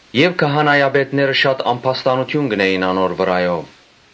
Եւ քահանայապետները շատ ամբաստանութիւն կ’ընէին անոր վրայով։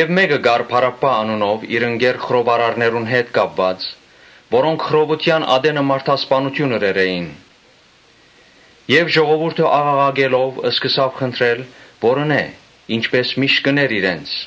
Մէկը կար Բարաբբա անունով՝ իր ընկեր խռովարարներուն հետ կապուած, որոնք խռովութեան ատենը մարդասպանութիւն ըրեր էին։ Ժողովուրդը աղաղակելով՝ սկսաւ խնդրել որ ընէ, ինչպէս միշտ կ’ընէր իրենց։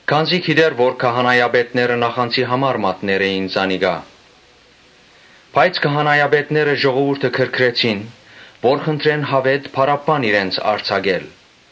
Քանզի գիտէր թէ քահանայապետները նախանձի համար մատներ էին զանիկա։ Քահանայապետները ժողովուրդը գրգռեցին որ խնդրեն Բարաբբան արձակել։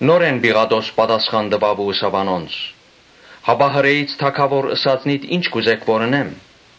Նորէն Պիղատոս հարցուց ու ըսաւ անոնց. «Հապա Հրէից թագաւորը ի՞նչ կ’ուզէք որ ընեմ»։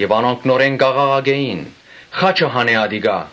Անոնք աղաղակեցին. «Խա՛չը հանէ ատիկա»։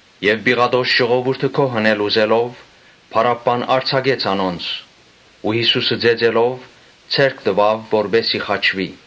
Պիղատոս ժողովուրդը գոհացնել ուզելով՝ Բարաբբան արձակեց անոնց ու Յիսուսը ծեծելով՝ անոնց ձեռքը տուաւ որպէս զի խաչուի։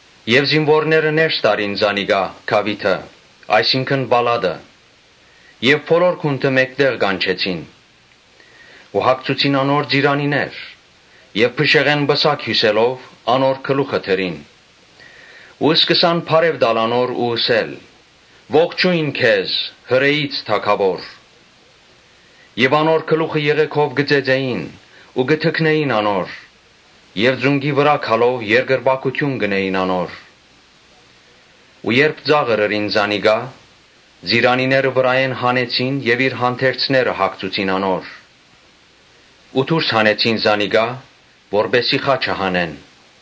Զինուորները ներս տարին զանիկա գաւիթը, այսինքն պալատը եւ բոլոր գունդը մէկտեղ կանչեցին, Ու հագցուցին անոր ծիրանիներ եւ փշեղէն պսակ հիւսելով՝ անոր գլուխը դրին։ Ու սկսան բարեւ տալ անոր ու ըսել. «Ողջո՛յն քեզ, Հրէից թագաւոր»։ Անոր գլուխը եղէգով կը ծեծէին ու կը թքնէին անոր վրայ եւ ծունկի վրայ գալով երկրպագութիւն կ’ընէին անոր։ Երբ ծաղր ըրին զանիկա, ծիրանիները վրայէն հանեցին եւ իր հանդերձները հագցուցին անոր ու դուրս հանեցին զանիկա՝ որպէս զի խաչը հանեն։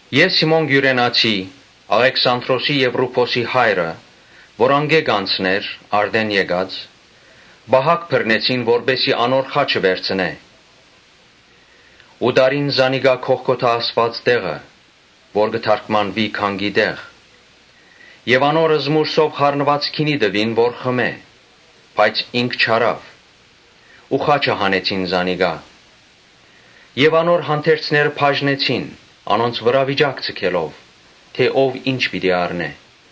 Եւ Սիմոն Կիւրենացին, Աղեքսանդրոսին եւ Ռուփոսին հայրը, որ ատկէ կ’անցնէր արտէն եկած, ստիպեցին որ անոր խաչը վերցնէ։ Ու տարին զանիկա Գողգոթա ըսուած տեղը, (որ կը թարգմանուի Գանկի տեղ,) Եւ անոր զմուռսով խառնուած գինի տուին որ խմէ, բայց ինք չառաւ։ Ու խաչը հանեցին զանիկա եւ անոր հանդերձները բաժնեցին՝ անոնց վրայ վիճակ ձգելով թէ՝ ո՞վ ի՛նչ պիտի առնէ։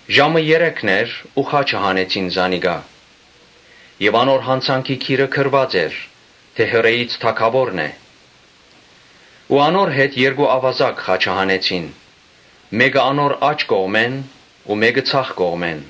Ժամը երեքն էր ու խաչը հանեցին զանիկա։ Անոր յանցանքի գիրը գրուած էր թէ «Հրէից թագաւորն է»։ Ու անոր հետ երկու աւազակ խաչը հանեցին. մէկը անոր աջ կողմը ու միւսը ձախ կողմը։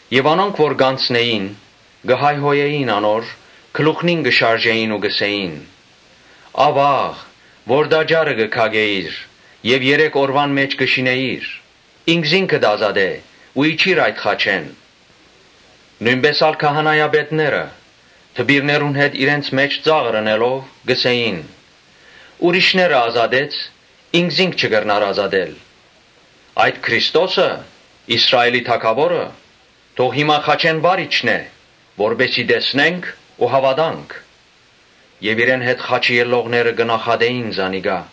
Եւ անոնք որ կ’անցնէին՝ կը հայհոյէին անոր, գլուխնին կը շարժէին ու կ’ըսէին. «Աւա՜ղ որ տաճարը կը քակէիր եւ երեք օրուան մէջ կը շինէիր։ Ինքզինքդ ազատէ՛ ու իջի՛ր խաչէն»։ Նոյնպէս ալ քահանայապետները դպիրներուն հետ իրենց մէջ ծաղր ընելով՝ կ’ըսէին. «Ուրիշները ազատեց, ինքզինք չի կրնար ազատել։ Այդ Քրիստոսը, Իսրայէլի թագաւորը, թող հիմա խաչէն վար իջնէ, որպէս զի տեսնենք ու հաւատանք»։ Եւ իրեն հետ խաչուողները կը նախատէին զանիկա։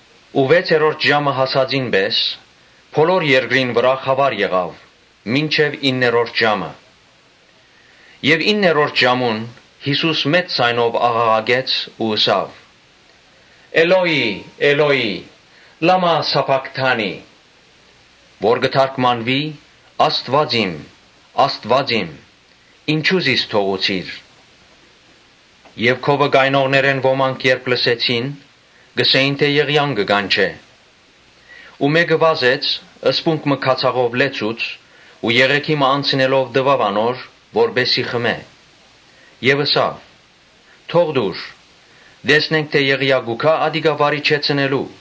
Վեցերորդ ժամը հասածին պէս՝ բոլոր երկրին վրայ խաւար եղաւ մինչեւ իններորդ ժամը։ Իններորդ ժամուն՝ Յիսուս մեծ ձայնով աղաղակեց ու ըսաւ. «Էլօի՜, Էլօի՜, լա՞մա սաբաքթանի». որ կը թարգմանուի՝ «Աստուա՜ծ իմ, Աստուա՜ծ իմ, ինչո՞ւ զիս թողուցիր»։ Եւ քովը կայնողներէն ոմանք երբ լսեցին՝ ըսին թէ՝ Եղիան կը կանչէ։ Ու մէկը վազեց սպունգ մը քացախով լեցուց ու եղէգի մը անցնելով՝ տուաւ անոր որպէս զի խմէ եւ ըսաւ. «Թող տուր, տեսնենք թէ Եղիան պիտի գա՞յ ատիկա վար իջեցնելու»։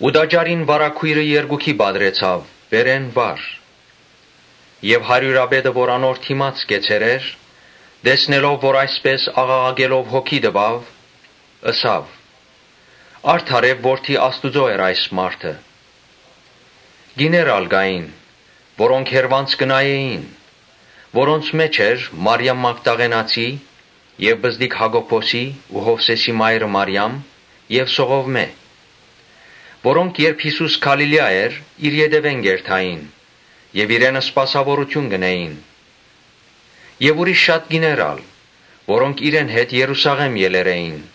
Տաճարին վարագոյրը երկուքի պատռուեցաւ վերէն վար։ Հարիւրապետը, որ անոր դէմ կեցեր էր, տեսնելով որ այսպէս աղաղակելով հոգի տուաւ, ըսաւ. «Արդարեւ Որդի Աստուծոյ էր այս մարդը»։ Կիներ ալ կային, որոնք հեռուէն կը նայէին։ Անոնց մէջ էին Մարիամ Մագդաղենացին եւ պզտիկ Յակոբոսին ու Յովսէսին մայրը Մարիամը եւ Սողովմէն, Որոնք երբ Յիսուս Գալիլիա էր, անոր ետեւէն կ’երթային եւ սպասաւորութիւն կ’ընէին։ Ուրիշ շատ կիներ ալ՝ որոնք իրեն հետ Երուսաղէմ ելեր էին։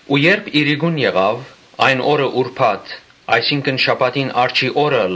Երբ իրիկուն եղաւ, այն օրը ուրբաթ էր, այսինքն շաբաթին առջի օրը,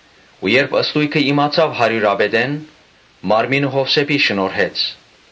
Երբ ան ստոյգը իմացաւ հարիւրապետէն, մարմինը Յովսէփին շնորհեց։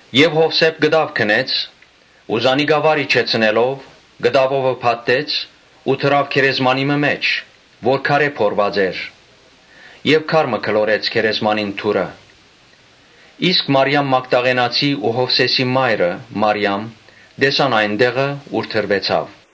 Յովսէփ կտաւ գնեց ու զանիկա վար իջեցնելով՝ կտաւով փաթթեց ու դրաւ գերեզմանի մը մէջ՝ որ քարէ փորուած էր եւ քար մը գլորեց գերեզմանին դուռը։ Իսկ Մարիամ Մագդաղենացին ու Յովսէսին մայրը Մարիամը տեսան այն տեղը, ուր դրուեցաւ։